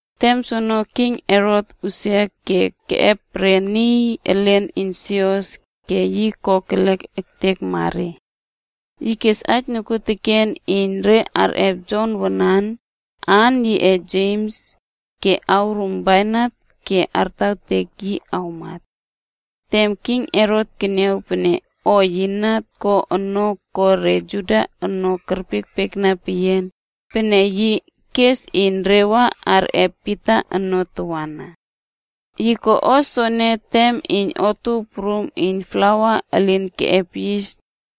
Tem soene King Herota usia ke keꞌep re niy elen iyn sios, ke yi kokelek ektekma re. Yi kes aij nokuoteken iyn re kerꞌep Jon wanan, aan yiꞌe Jems, ke korouw bainat ke kartawtek yi kamat. Tem king Herot keniaw pene o yi na ko ono ko re Juda ono kerpiekpiekna peyian, peneke yi kes iyn re wa arꞌep Pita ono tawana. Yi ko o soene tem iyn Otuow Prum iyn Plawa Elin Keꞌep Yis,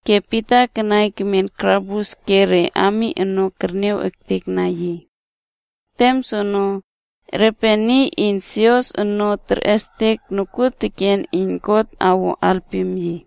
Peneke Pita kanai kemen karabus ke re ami ono terniaw ektekna yi. Tem soono, repe niy iyn sios ono terꞌestek nokuoteken iyn God awo alpim yi.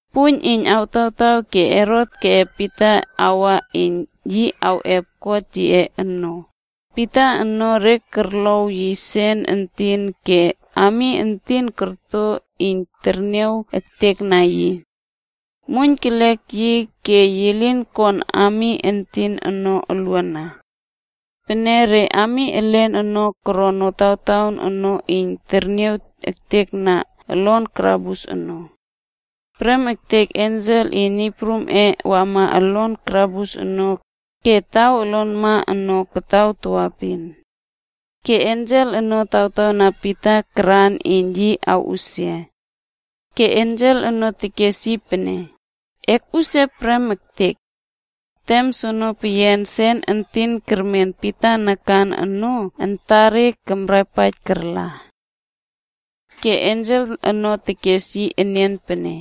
Puiyn iyn awtawtaw ke Herot awꞌep Pita awa iyn yi awꞌep kot yiꞌe ono, Pita ono re korow yi sen entin ke ami entin korto iyn terniaw ektekna yi. Muoiyn kelek yi ke yi kon ami entin ono uluana. Pene re ami elen ono koron notawtaon ono iyn terniaw ektekna olon karabus ono. Prem ektek ensel iyn Niy Prumꞌe wama olon karabus ono ke taw olonma ono kataw tawaepin. Ke ensel ono tawtawna Pita karan iyn yi awꞌusia. Ke ensel ono tekes yi pene, “Ekꞌusia prem ektek!” Tem soono peyian sen entin kermen Pita nakan ono antare karꞌapaij karla. Ke ensel ono tekes yi enian pene,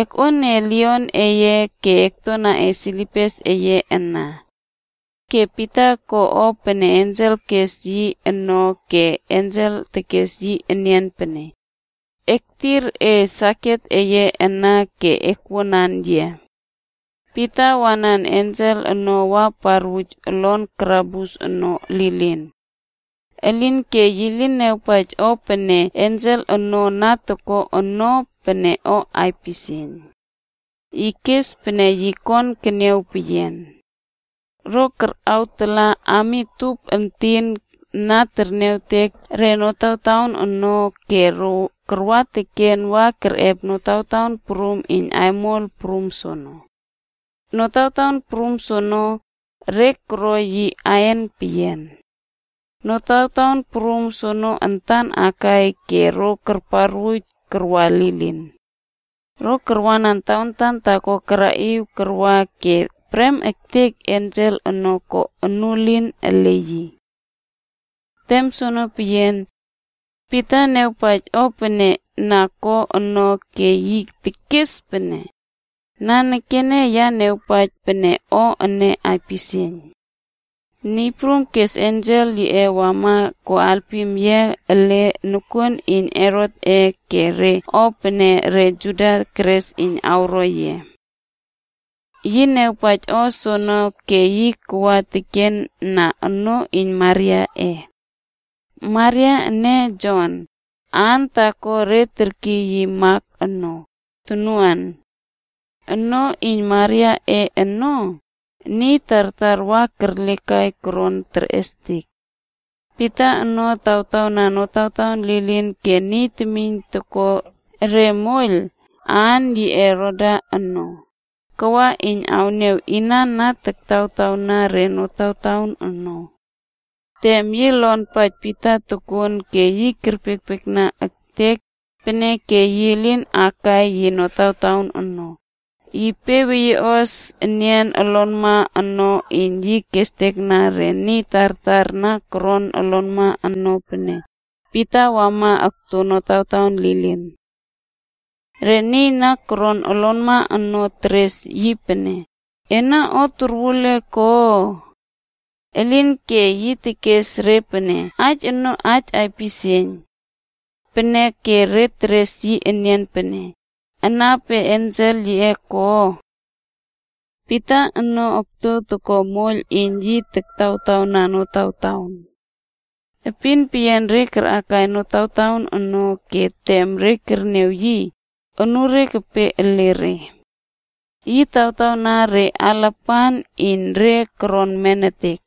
“Eknuoiy e leiꞌon eye ke ektuana e sendel eye ana.” Ke Pita ko o pene ensel kes yi ono ke ensel tekes yi enian pene, “Ektir e saket eye ana ke akwuanan yia.” Pita wanan ensel ono wa parwuj olon karabus ono lilin. Elinke yi lin niawpaij o pene ensel ono na toko ono pene o aipisieiyn. Yi kes pene yi kon tekniaw peyian. Ro karꞌawtala ami tup entin na terniawtek re notawtaon ono ke ro karwa teken wa kerꞌep notawtaon prum iyn aimol prum soono. Notawtaon prum soono, re koro yi ain peyian. Notawtaon prum ono antan akai ke ro karparwuj karwa lilin. Ro karwanan tawantan taako karaꞌiw karwa ke prem ektek ensel ono ko onuelin ele yi. Tem soono peyian, Pita niawpaij o pene na ko ono ke yi tekes pene, “Nanekene ya niawpaij pene o ene aipisieiyn. Niy Prum kes ensel yiꞌe wama ko alpim yia ele nokuon iyn Herotꞌe ke re o pene re Juda keres iyn awro yia.” Yi niawpaij o soono ke yi kawa teken na onoo iyn Mariaꞌe. Maria ene Jon, aan taako re terkiy yi Mak ono, tonuan. Onoo iyn Mariaꞌe ono, niy tartar wa kerlekai koron terꞌestek. Pita ono taktawtawna notawtaon lilin ke niy temiyn toko re moiyl, aan yiꞌe Roda ono, kawa iyn awniaw inan na taktawtawna re notawtaon ono. Tem yi lonpaij Pita tokon ke yi kerpiekpiekna ektek, peneke yi lin akai yi notawtaon ono, yi pe weyieꞌos enian olonma ono iyn yi awestekna re niy tartar na koron olonma ono pene Pita wama okto notawtaon lilin. Re niy na koron olonma ono teres yi pene, “Ena o torwul e ko?” Elinke, yi tekes re pene aij ono aij aipisieiyn. Peneke re teres yi enian pene, “Ana pe ensel yiꞌe ko?” Pita ono okto toko moiyl iyn yi taktawtawna notawtaon. Epin peyian re karꞌakai notawtaon ono ke tem re kerniaw yi, anure kepe ele re. Yi tawtawna re alapan iyn re koron nemetek.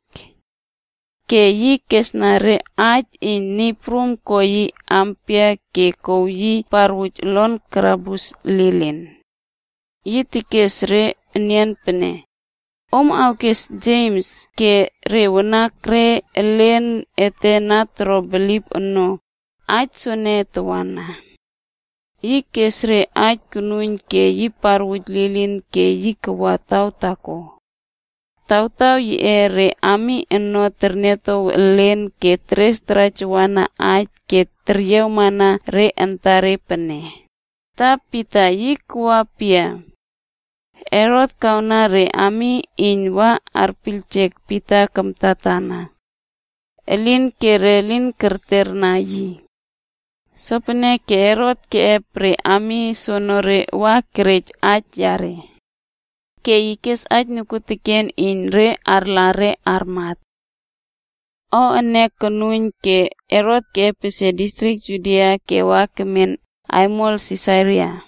Ke yi kesna re aij iyn Niy Prum ko yi ampia ke kouw yi parwuj olon karabus lilin. Ke yi tekes re enian pene, “Om awkes Jemsb ke re wanakre elen ete na toro bilip ono, aij soene tawana.” Yi kes re aij konuiyn ke yi parwuj lilin ke yi kawa taw taako. Tawtaw yiꞌe, re ami ono terniatow elen ke teres tarajawana aij ke tererweyiema re antare pene, “Ta Pita, yi kawa pia?” Herot kawna re ami iyn re wa arpiyljek Pita kamtatana. Elinke re lin kerterna yi. Sopeneke Herot keꞌep re ami soonore wa korot aij yare. Ke yi kes aij nokuoteken iyn re arla re armat. O ene konuiyn ke Herot epesie distrik Judia ke wa kemen aimol Sisaria.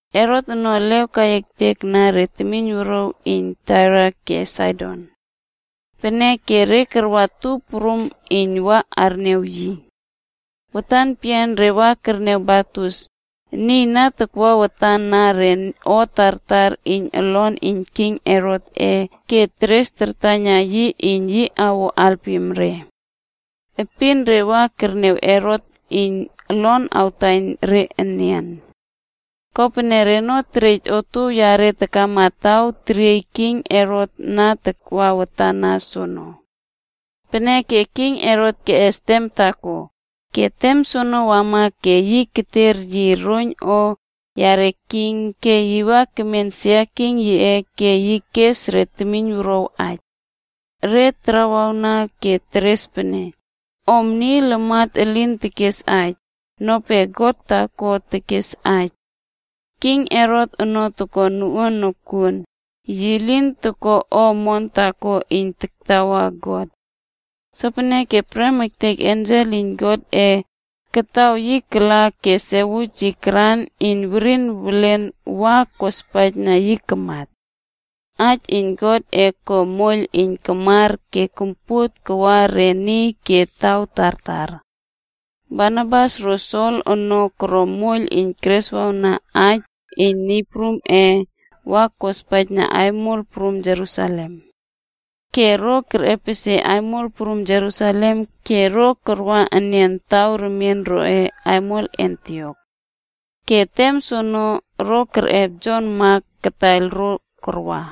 Herot ono elew kai ektekna re temiyn wuruaw iyn Tair ke Saidon. Peneke re karwa tup prum iyn wa arniaw yi. Watan peyian re wa kerniaw Blastus, niy na takwa watan na re o tartar iyn olon iyn king Herotꞌe ke keres kartaiyna yi iyn yi awo alpim re. Epin re wa kerniaw Herot iyn olon awtaiyn re enian. Kopene reno terej otuow reꞌe takama taw teriey king Herot na takwa watan na soono. Peneke king Herot keꞌes tem taako, ke tem soono wama ke yi kerter yi roiyn o yare king ke yi wa kemen sia king yiꞌe ke yi kes re temiyn wuruaw aij. Re tarawawna ke teres pene, “Ono niy lamat elin tekes aij, nope god taako tekes aij.” King Herot ono toko noꞌuan nokuon, yi lin toko o omon taako iyn taktawa God. Sopeneke prem ektek ensel iyn Niy Prumꞌe kataw yi kala ke sekewiej karꞌaiyn yi werin welen wa kospaijna yi kamat. Aij iyn Godꞌe ko moiyl iyn kamar, ke kompuot kawa re niy ke taw tartar. Barnabas ro Sol ono koro moiyl iyn kereswawna aij iyn Niy Prumꞌe wa kospaijna aimol prum Jerusalem. Ke ro kerꞌepesie aimol prum Jerusalem ke ro karwa enian taw remien roꞌe aimol Antiok. Ke tem soono, ro kerꞌep Jon Mak kataiyl ro karwa.